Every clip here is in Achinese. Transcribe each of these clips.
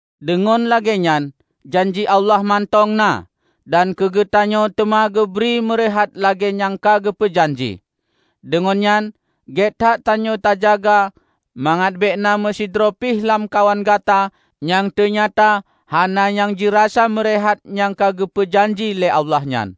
Deungon lagée nyan, janji Allah mantong na, dan keugeutanyoe teuma geubri meureuhat lagée nyang ka geupeu janji. Deungon nyan, gét that tanyoe tajaga mangat bék na meusidroe pih lamkawan gata nyang teunyata hana nyang jirasa meureuhat nyang ka geupeu janji lé Allah nyan.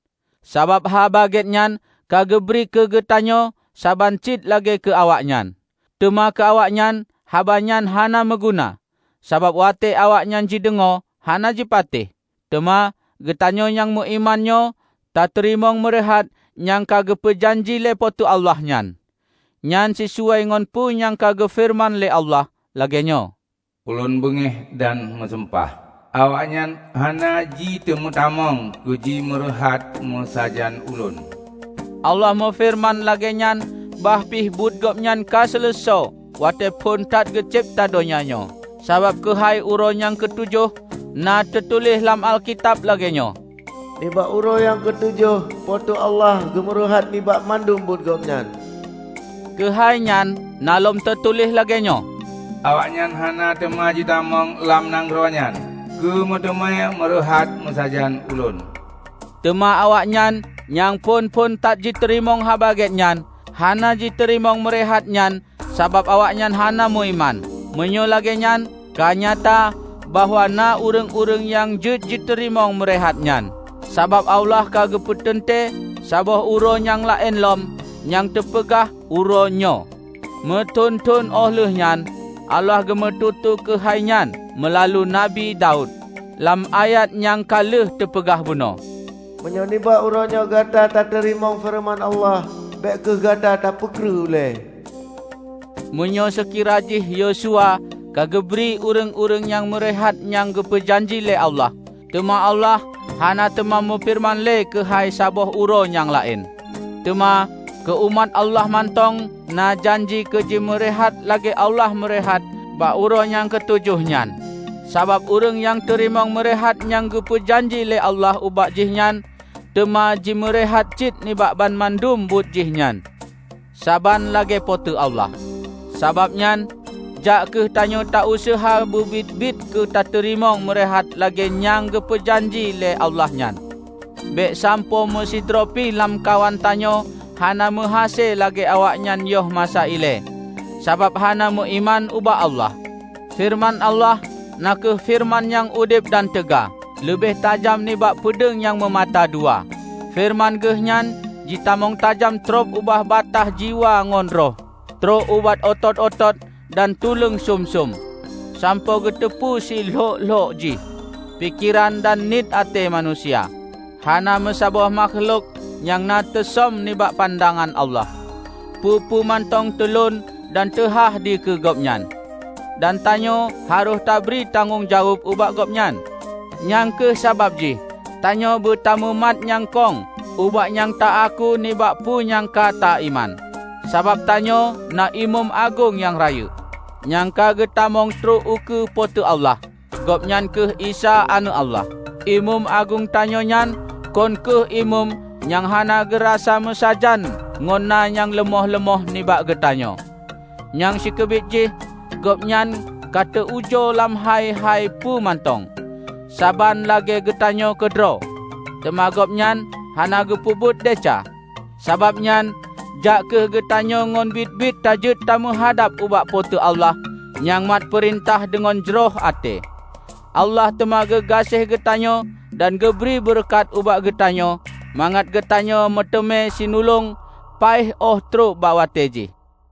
Sabab Haba Gét nyan ka geubri keugeutanyoe saban cit lagée keu awaknyan. Teuma keu awaknyan, haba nyan hana meuguna. Sabab, watée awaknyan jideungoe, hana jipatéh. Teuma, geutanyoe nyang meuiman nyoe tateurimong meureuhat nyang ka geupeu janji lé Po teu Allah nyan. Nyan sisuai ngon peue nyang ka geufeureuman lé Allah, lagée nyoe, "Ulôn beungéh dan meusumpah, 'Awaknyan hana jiteumeutamong keujimeureuhat meusajan Ulôn.' " Allah meufeureuman lagée nyan bah pi buet Gobnyan ka seuleusoe watée phon that geucebta donya nyoe. Sabab keuhai uroe nyang keutujoh, na teutuléh lam Alkitab lagée nyoe, "Nibak uroe nyang keutujoh Po teu Allah geumeureuhat nibak mandum buet Gobnyan." Keuhai nyan na lom teutuléh lagée nyoe, "Awaknyan hana teuma jitamong lam nanggroe nyan keu meuteumé meureuhat meusajan Ulôn." Teuma awaknyan nyang phon-phon that jiteurimong Haba Gét nyan, hana jiteurimong meureuhat nyan sabab awaknyan hana meuiman. Meunyoe lagée nyan ka nyata bahwa na ureuëng-ureuëng nyang jeuet jiteurimong meureuhat nyan. Sabab Allah ka geupeuteuntée saboh uroe nyang laén lom, nyang teupeugah "Uroe Nyoe". Meuthon-thon óh lheueh nyan Allah geumeututoe keuhai nyan meulalu Nabi Daud, lam ayat nyang ka lheueh teupeugah bunoe, "Meunyoe nibak uroenyoe gata tateurimong feureuman Allah, bék kheueh gata tapeukreuh ulée." Meunyoe seukira jih Yosua ka geubri ureuëng-ureuëng nyang meureuhat nyang geupeu janji lé Allah, teuma Allah hana teuma meufeureuman le keuhai saboh uroe nyang laén. Teuma, keu umat Allah mantong na janji keujimeureuhat lagée Allah meureuhat bak uroe nyan keutujoh nyan. Sabab ureuëng nyang teurimong meureuhat nyang geupeu janji lé Allah ubak jihnyan, teuma jimeureuhat cit nibak banmandum buet jih nyan, saban lagée Po teu Allah. Sabab nyan, jak kheueh tanyoe ta useuha beubiet-biet keutateurimong meureuhat lagée nyang geupeu janji lé Allah nyan. Bék sampoe meusidroe pi lamkawan tanyoe hana meuhase lagée awaknyan yoh masa ilée, sabab hana meuiman ubak Allah. Feureuman Allah na kheueh feureuman nyang udeb dan teuga; leubeh tajam nibak peudeueng nyang meumata dua. Feureuman Geuhnyan jitamong tajam trob ubak bataih jiwa ngon roh; trok ubak atot-atot dan tuleueng sum-sum, sampoe geuteupeue si lhok-lhok jih pikeran dan niet até manusia. Hana meusaboh makhlok nyang na teusöm nibak pandangan Allah. Peue-peue mantong teulon dan teuhah dikeue Gobnyan. Dan tanyoe harôh tabri tanggong jaweueb ubak Gobnyan. Nyang kheueh sabab jih tanyoe beutamumat nyang kong ubak nyang ta aku nibak peue nyang ka ta iman. Sabab tanyoe na Imeum Agong nyang rayeuk, nyang ka geutamong trok ukeue Po teu Allah -- Gobnyan kheueh Isa Aneuëk Allah. Imeum Agong tanyoe nyan kon kheueh imeum nyang hana geurasa meusajan ngon na nyang leumoh-leumoh nibak geutanyoe. Nyang sikeubiet jih, Gobnyan ka teu ujoe lam hai-hai peue mantong, saban lagée geutanyoe keudroe; teuma Gobnyan hana geupeubuet desya! Sabab nyan, jak kheueh geutanyoe ngon biet-biet tajeuet tameuhadab ubak Po teu Allah nyang mat peurintah deungon jroh até. Allah teuma geugaséh geutanyoe dan geubri beureukat ubak geutanyoe mangat geutanyoe meuteumé sinulong paih óh trok bak watée jih.